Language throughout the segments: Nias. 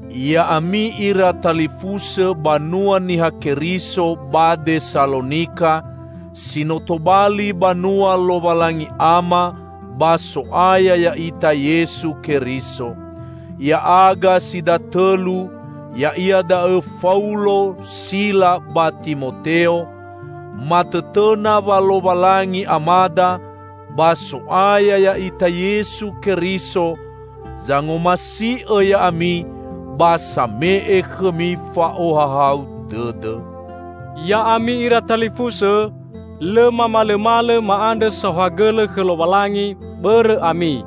Ya'ami ira talifusõ banua Niha Keriso ba Desalonika, si no tobali banua Lowalangi Ama ba So'aya ya'ita Yesu Keriso! Ya'aga si datõlu ya'ia da'õ Faulo, Sila ba Timoteo, matõtõna wa Lowalangi Amada ba So'aya ya'ita Yesu Keriso zangomasi'õ ya'ami ba same'e khõmi fa'ohahau dõdõ. Ya'ami ira talifusõ, lõ mamalõmalõ ma'andrõ saohagõlõ khõ Lowalangi, bõrõ ami.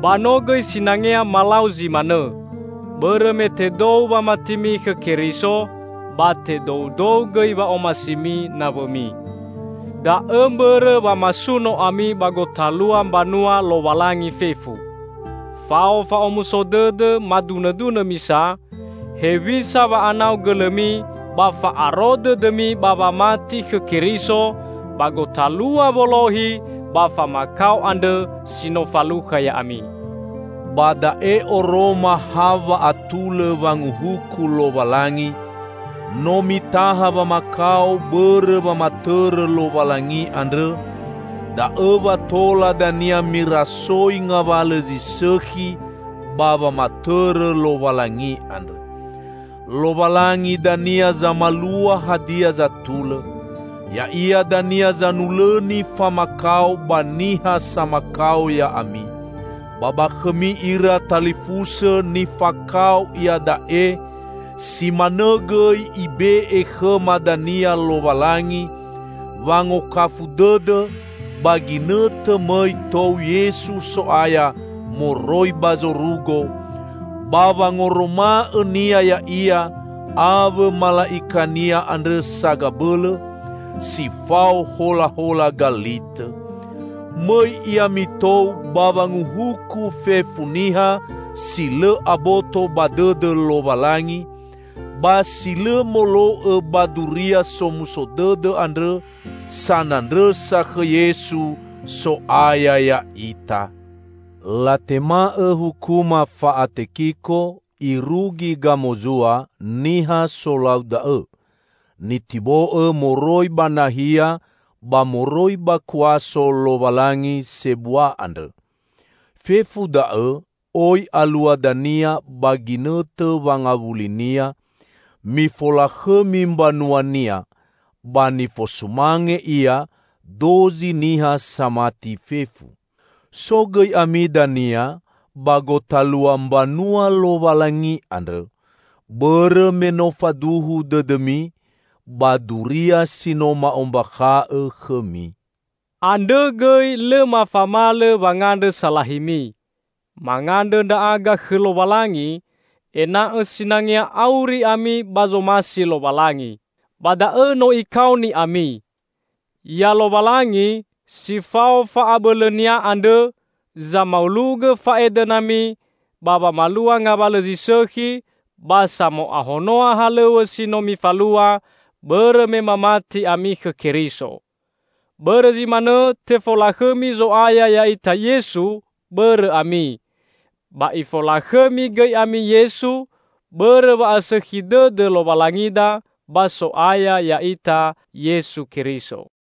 Ba no gõi sinangea malau zi manõ, bõrõ me tedou wamatimi khõ Keriso, ba tedoudou gõi wa'omasimi nawõmi. Da'õ mbõrõ wa masuno ami ba gotalua mbanua Lowalangi fefu. Fao fa'omuso dõdõ madunõdunõ misa, hewisa wa'anau gõlõmi ba fa'aro dõdõmi ba wamati khõ Keriso ba gotalua wolohi ba famakao andrõ si no falukha ya'ami. Ba da'e oroma ha wa'atulõ wanguhuku Lowalangi: No mitaha wamakao bõrõ wamatõrõ Lowalangi andrõ, da'õ wa tola dania mirasoi ngawalõ zi sõkhi ba wamatõrõ Lowalangi andrõ. Lowalangi dania zamalua hadia zatulõ. Ya'ia dania zanulõni famakao ba niha samakao ya'ami. Ba ba khõmi ira talifusõ nifakao iada'e -- si manõ gõi Ibe'e khõma dania -- Lowalangi wangokafu dõdõ -- ba ginõtõ mõi tou Yesu So'aya moroi ba zorugo, ba wangoroma'õ-Nia Ya'ia awõ mala'ika-Nia andrõ sagabõlõ, si fao holahola galitõ. Mõi Ia mitou ba wanguhuku fefu niha si lõ aboto ba dõdõ Lowalangi, ba si lõ molo'õ ba Duria Somuso Dõdõ andrõ sanandrõsa khõ Yesu, So'aya ya'ita. Latema'õ hukuma fa'atekiko irugi gamozua niha solau da'õ, nitibo'õ moroi ba nahia ba moroi ba kuaso Lowalangi sebua andrõ, fefu da'õ oi alua dania ba ginõtõ wangawuli-Nia mifolakhõmi mbanua-Nia, ba nifosumange Ia dozi niha samati fefu. So gõi ami dania ba gotalua mbanua Lowalangi andrõ, bõrõ me no faduhu dõdõmi ba duria si no ma'ombakha'õ khõmi. Andrõ gõi lõ mafamalõ wangandrõ salahimi. Mangandrõ ndra'aga khõ Lowalangi, ena'õ sinangea auri ami ba zomasi Lowalangi; ba da'õ no Ikaoni ami. Ya Lowalangi, si fao fa'abõlõ-Nia andrõ, zamaulogõ fa'edõnami ba wamalua ngawalõ zi sõkhi, ba samo'ahonoa halõw̃õ si no mifalua bõrõ me mamati ami khõ Keriso. Bõrõ zi manõ tefolakhõmi Zo'aya ya'ita Yesu bõrõ ami, ba Ifolakhõmi gõi ami Yesu, bõrõ wa'asõkhi dõdõ Lowalangida ba So'aya ya'ita Yesu Keriso.